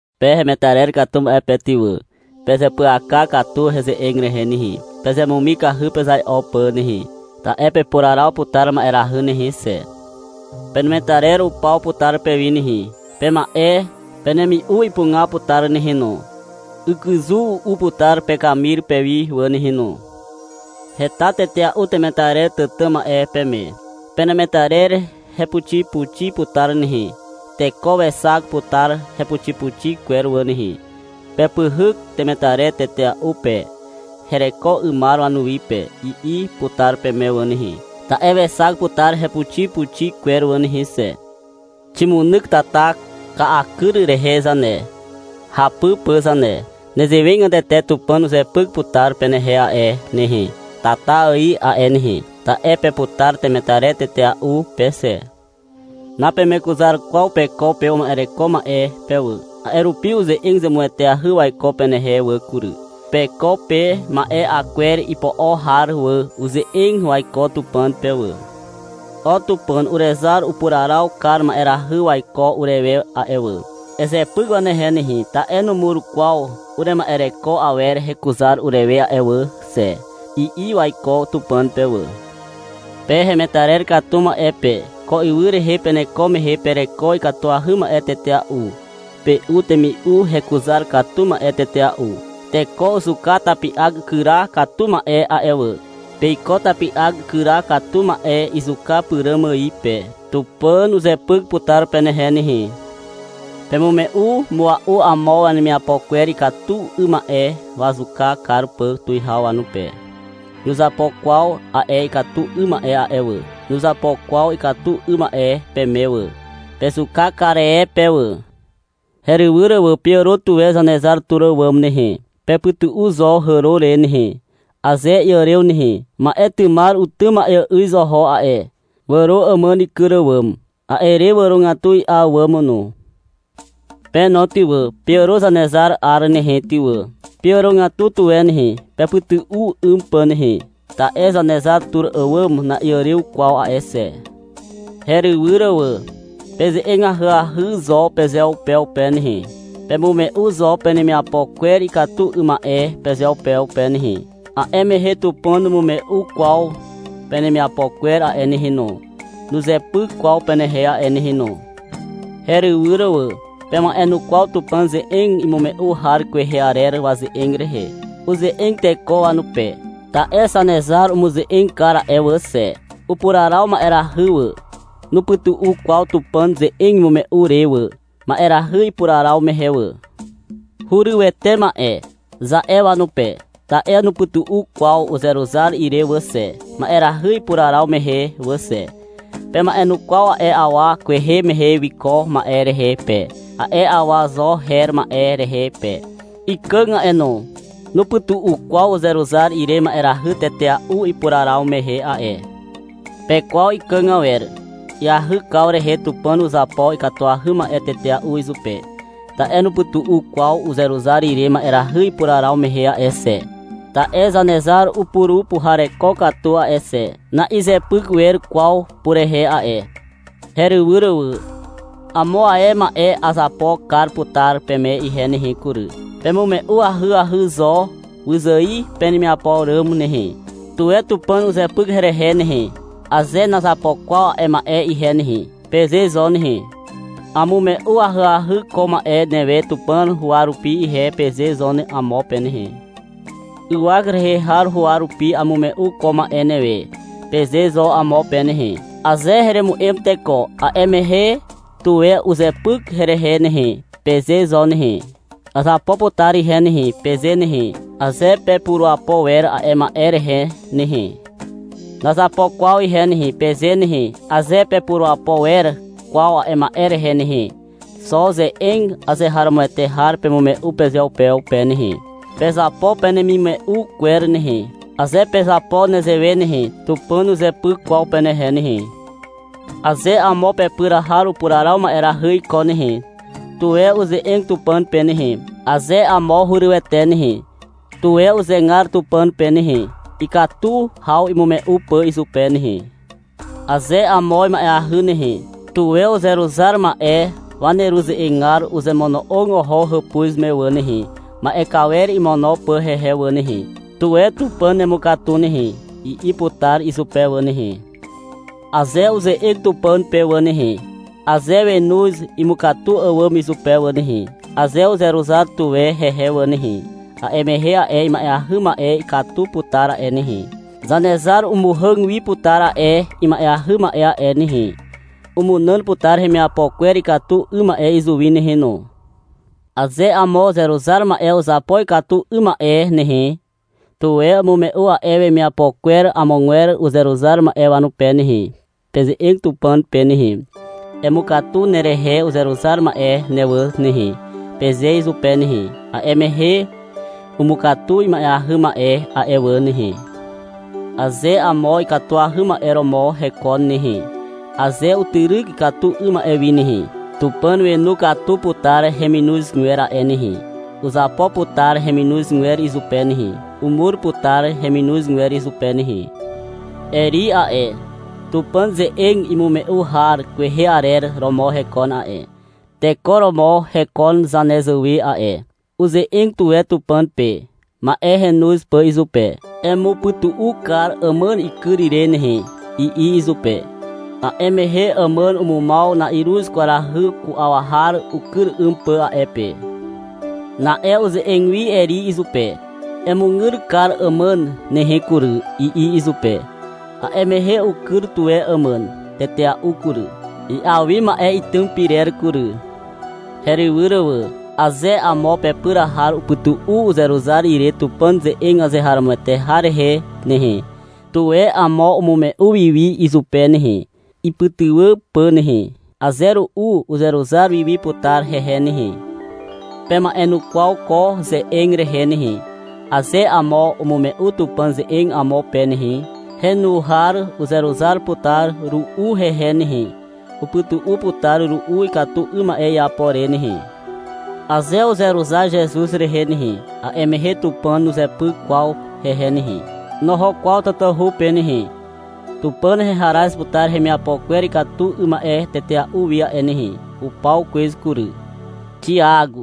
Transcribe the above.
Pe hemetarer katu ma'e pe ty wà, pezeapyaka katu heze'eg rehe nehe. Pezemumikahy pezai'o pà nehe, ta'e pepuraraw putar ma'erahy nehe xe. Penemetarer upaw putar pewi nehe. Pema'e penemi'u ipuga putar nehe no. Ykyzu u'u putar pekamir pewi wà nehe no. Heta tetea'u temetarer tàtà ma'e peme. Penemetarer hepuxipuxi putar nehe. Teko wexak putar hepuxipuxi kwer wà nehe. Pepyhyk temetarer tetea'u pe, hereko 'ymar wanuwi pe, i'i putar peme wà nehe, ta'e wexak putar hepuxipuxi kwer wà nehe xe. Ximunyk tata ka'a kyr rehe zane, hapy pà zane. Nezewegatete Tupàn uzepyk putar penehe a'e nehe, tata ài a'e nehe, ta'e peputar temetarer tetea'u pe xe. Napemekuzar kwaw peko pe uma'ereko ma'e pe wà. A'e rupi uze'eg zemueteahy waiko penehe wà kury. Peko pe ma'e 'a kwer ipo'o har wà, uze'eg waiko Tupàn pe wà. — O Tupàn. Urezar upuraraw kar ma'erahy waiko urewe a'e wà. Ezepyk wanehe nehe. Ta'e numur kwaw urema'ereko awer hekuzar urewe a'e wà xe, i'i waiko Tupàn pe wà. Pe hemetarer katu ma'e pe. Ko ywy rehe peneko mehe pereko ikatuahy ma'e tetea'u. Pe'u temi'u hekuzar katu ma'e tetea'u. Teko uzuka tapi'ak ikyra katu ma'e a'e wà. Peiko tapi'ak ikyra katu ma'e izuka pyràm ài pe. Tupàn uzepyk putar penehe nehe. Pemume'u mua'u amo wanemiapo kwer ikatu 'ym ma'e, wazuka kar pà tuwihaw wanupe. Nuzapo kwaw a'e ikatu 'ym ma'e a'e wà. Nuzapo kwaw ikatu 'ym ma'e peme wà. Pezuka kar e pe wà. Herywyr wà. Peàro tuwe Zanezar tur àwàm nehe. Pepytu'u zo hàro re nehe, aze iàrew nehe. Ma'etymar utym ma'eà'yz oho a'e. Wàro àmàn ikyr àwàm. A'e re wàrogatu i'a àwàm no. Pe no ty wà, peàro Zanezar 'ar nehe ty wà. Peàrogatu tuwe nehe, pepytu'u 'ym pà nehe. Ta'e Zanezar tur àwàm na'iàrew kwaw a'e xe. Herywyr wà. Peze'eg ahyahy zo pezeupeupe nehe. Pemume'u zo penemiapo kwer ikatu 'ym ma'e pezeupeupe nehe. A'e mehe Tupàn numume'u kwaw penemiapo kwer a'e nehe no. Nuzepyk kwaw penehe a'e nehe no. Herywyr wà. Pema'enukwaw Tupàn ze'eg imume'u har kwehe arer waze'eg rehe. Uze'eg teko wanupe, ta'e Zanezar umuze'eg kar a'e wà xe. Upuraraw ma'erahy wà. Nupytu'u kwaw Tupàn ze'eg imume'u re wà, ma'erahy ipuraraw mehe wà. — Hurywete ma'e, za'e wanupe, ta'e nupytu'u kwaw uzeruzar ire wà xe, ma'erahy ipuraraw mehe wà xe. Pema'enukwaw a'e awa kwehe mehe wiko ma'e rehe pe, a'e awa Zo her ma'e rehe pe. Ikàg a'e no. Nupytu'u kwaw uzeruzar ire ma'erahy tetea'u ipuraraw mehe a'e. Pekwaw ikàg awer. Iahykaw rehe Tupàn uzapo ikatuahy ma'e tetea'u izupe, ta'e nupytu'u kwaw uzeruzar ire ma'erahy ipuraraw mehe a'e xe. Ta'e Zanezar upurupuhareko katu a'e xe. Na'izepyk wer kwaw purehe a'e. Herywyr wà. Amo ae ma'e azapo kar putar peme ihe nehe kury. Pemume'u ahyahy zo wyzài penemiapo ràm nehe. — Tuwe Tupàn uzepyk herehe nehe, aze nazapo kwaw a'e ma'e ihe nehe, peze zo nehe. — Amume'u ahyahy ko ma'e newe Tupàn huwa rupi ihe, peze zo amo pe nehe. — Ywak rehe har huwa rupi amume'u ko ma'e newe, peze zo amo pe nehe. — Aze heremu'em teko, a'e mehe, tuwe uzepyk herehe nehe, peze zo nehe. — Azapo putar ihe nehe, peze nehe, aze pepurapo wer a'e ma'e rehe nehe. — Nazapo kwaw ihe nehe, peze nehe, aze napepurapo wer kwaw a'e ma'e rehe nehe. Xo ze'eg azeharomoete har pemume'u pezeupeupe nehe. Pezapo penemimume'u kwer nehe. Aze pezapo nezewe nehe, Tupàn nuzepyk kwaw penehe nehe. Aze amo pepyr har upuraraw ma'erahy iko nehe, tuwe uze'eg Tupàn pe nehe. Aze amo hurywete nehe, tuwe uzegar Tupàn pe nehe, ikatu haw imume'u pà izupe nehe. Aze amo ima'eahy nehe, tuwe uzeruzar ma'e waneruze'egar uzemono'og oho hàpuz me wà nehe, ma'e kawer imono pà hehe wà nehe. — Tuwe Tupàn nemukatu nehe, i'i putar izupe wà nehe. Aze uze'eg Tupàn pe wà nehe, aze wenoz imukatu àwàm izupe wà nehe, aze uzeruzar tuwe hehe wà nehe, a'e mehe a'e ima'eahy ma'e ikatu putar a'e nehe. Zanezar umuhàg wi putar a'e ima'eahy ma'e a'e nehe. Umunàn putar hemiapo kwer ikatu 'ym ma'e izuwi nehe no. Aze amo uzeruzar ma'e uzapo ikatu 'ym ma'e nehe, tuwe umume'u a'e wemiapo kwer amogwer uzeruzar ma'e wanupe nehe. Peze'eg Tupàn pe nehe. — Emukatu nerehe uzeruzar ma'e ne wà nehe, peze izupe nehe. A'e mehe, umukatu ima'eahy ma'e a'e wà nehe. Aze amo ikatuahy ma'e romo hekon nehe, aze utyryk ikatu 'ym ma'e wi nehe, Tupàn wenu katu putar heminozgwer a'e nehe. Uzapo putar heminozgwer izupe nehe. Umur putar heminozgwer izupe nehe. Eri a'e, Tupàn ze'eg imume'u har kwehe arer romo hekon a'e. Teko romo hekon zanezàwe a'e. Uze'eg tuwe Tupàn pe, ma'e henoz pà izupe. — Emupytu'u kar àmàn ikyr ire nehe, i'i izupe. A'e mehe àmàn umumaw na'iruz kwarahy ku'aw har ukyr 'ym pà a'e pe. Na'e uze'eg wi Eri izupe. — Emugyr kar àmàn nehe kury, i'i izupe. A'e mehe ukyr tuwe àmàn tetea'u kury. I'a wi ma'e itym pyrer kury. Herywyr wà. Aze amo pepyr har upytu'u uzeruzar ire Tupàn ze'eg azeharomoete har rehe nehe, tuwe amo umume'u wiwi izupe nehe, ipytywà pà nehe. Aze ru'u uzeruzar wiwi putar hehe nehe. Pema'enukwaw ko ze'eg rehe nehe. Aze amo umume'u Tupàn ze'eg amo pe nehe, henu har uzeruzar putar ru'u hehe nehe. Upytu'u putar ru'u ikatu 'ym ma'e iapo re nehe. Aze uzeruzar Zezuz rehe nehe, a'e mehe Tupàn nuzepyk kwaw hehe nehe. Noho kwaw tatahu pe nehe. Tupàn heharaz putar hemiapo kwer ikatu 'ym ma'e tetea'u wi a'e nehe. Upaw kwez kury. Xiak.